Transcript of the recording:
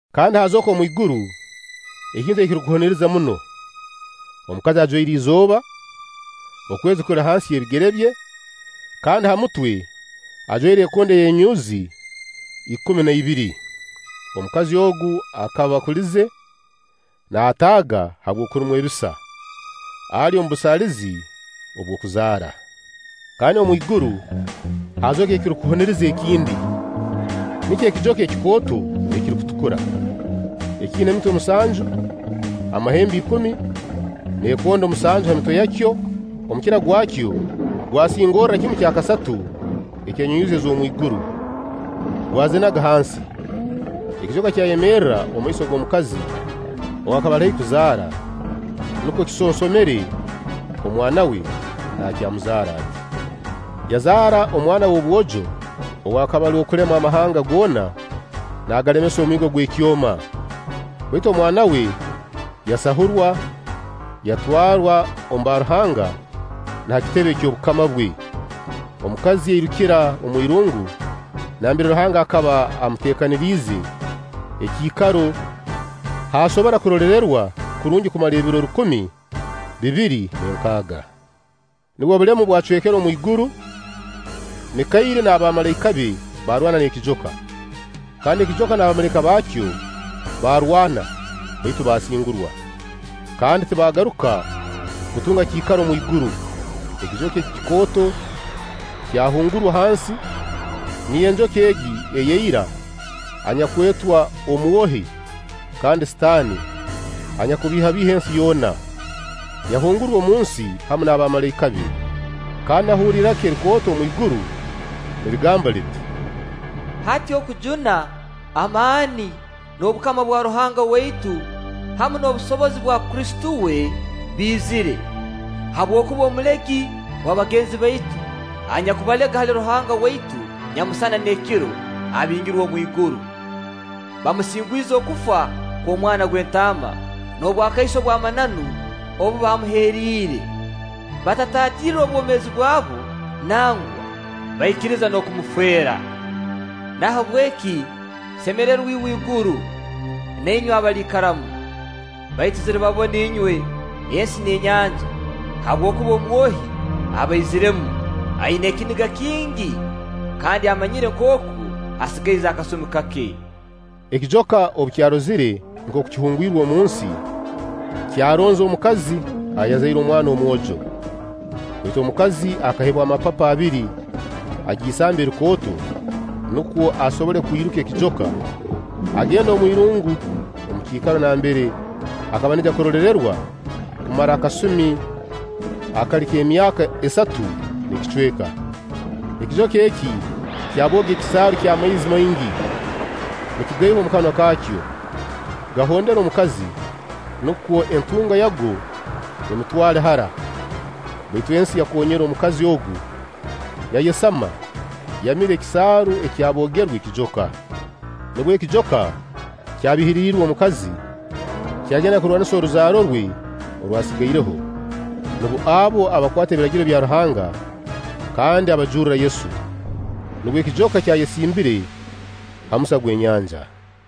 Kandi haazooka omwiguru ekintu ekirukuhuniriza muno: omukazi ajwaire izooba, okwezi kuli hansi y'ebigere bye, kandi ha mutwe ajwaire ekondo ey'enyunyuuzi ikumi na ibiri. Omukazi ogu akaba akulize, naataaga habw'okurumwa ebisa, ali omu busaalizi obw'okuzaara. Kandi omwiguru haazooka ekirukuhuniriza ekindi; nikyo ekijoka ekikooto ekirukutukura, ekiina emitwe musanju, amahembe ikumi, n'ekondo musanju ha mitwe yakyo. Omukira gwakyo gwasingorra kimu kya kasatu eky'enyunyuuzi ez'omwiguru, gwazinaga hansi. Ekijoka kyayemerra omumaiso g'omukazi ow'akaba ali haihi kuzaara, nukwo kisonsomere omwana we naakyamuzaara ati. Yazaara omwana w'obwojo ow'akaba ali w'okulema amahanga goona naagalemesa omwigo ogw'ekyoma, baitu omwana we yasahurwa, yatwarwa omba Ruhanga na ha kitebe eky'obukama bwe. Omukazi yairukira omwirungu nambere Ruhanga akaba amuteekaniriize ekiikaro h'asobora kuroleererwa kurungi okumara ebiro rukumi bibiri n'enkaaga. Nubwo obulemu bwacwekere omwiguru, Mikairi na bamalaika be baarwana n'ekijoka; kandi ekijoka na bamalaika baakyo baarwana, baitu baasingurwa, kandi tibaagaruka kutunga kiikaro omu iguru. Ekijoka eki kikooto kyahungurwa hansi, niyo enjoka egi eya ira enyakwetwa Omwohi kandi Sitaani, anyakubiihabiiha ensi yoona--yahungurwa omunsi hamu na bamalaika be. Kandi nahurra iraka erikooto omwiguru nirigamba liti: “Hati okujuna, amaani, n'obukama bwa Ruhanga waitu hamu n'obusobozi obwa Kristo we biizire, habwokuba omulegi wa bagenzi baitu, anyakubalega hali Ruhanga waitu nyamusana n'ekiro, abingirwe omwiguru. Bamusingwize okufa kw'Omwana gw'Entaama n'obwakaiso bw'amananu obu bamuheriire; batataatirre bwomeezi bwabo, nangwa baikiriza n'okumufeera. Nahabweki, semererwa iwe iguru, na inywe abaliikaramu! Baitu ziribabona inywe ensi n'enyanja, habwokuba Omwohi abaiziiremu aina ekiniga kingi, kandi amanyire nkooku asigaize akasumi kake!” Ekijoka obu kyarozire nkooku kihungwirwe omunsi, kyaronza omukazi ayazaire omwana omwojo. Baitu omukazi akaheebwa amapapa abiri ag'isamba erikooto, nukwo asobole kwiruka ekijoka, agende omu irungu, omu kiikaro nambere akaba naija kuroleerererwa okumara akasumi akali nk'emyaka esatu n'ekicweka. Ekijoka eki kyabooga ekisaaru ky'amaizi maingi, nikigaiha omu kanwa kaakyo, gahondere omukazi, nukwo entunga yago emutwale hara; baitu ensi yakoonyera omukazi agu, yayesama, yamira ekisaaru ekyaboogerwe ekijoka. Nubwo ekijoka kyabiihiriirwe omukazi, kyagenda kurwanisa oruzaaro rwe orwasigaireho, nubo abo abakwata Ebiragiro bya Ruhanga kandi abajurra Yesu. Nubwo ekijoka kyayesimbire ha musa gw'enyanja.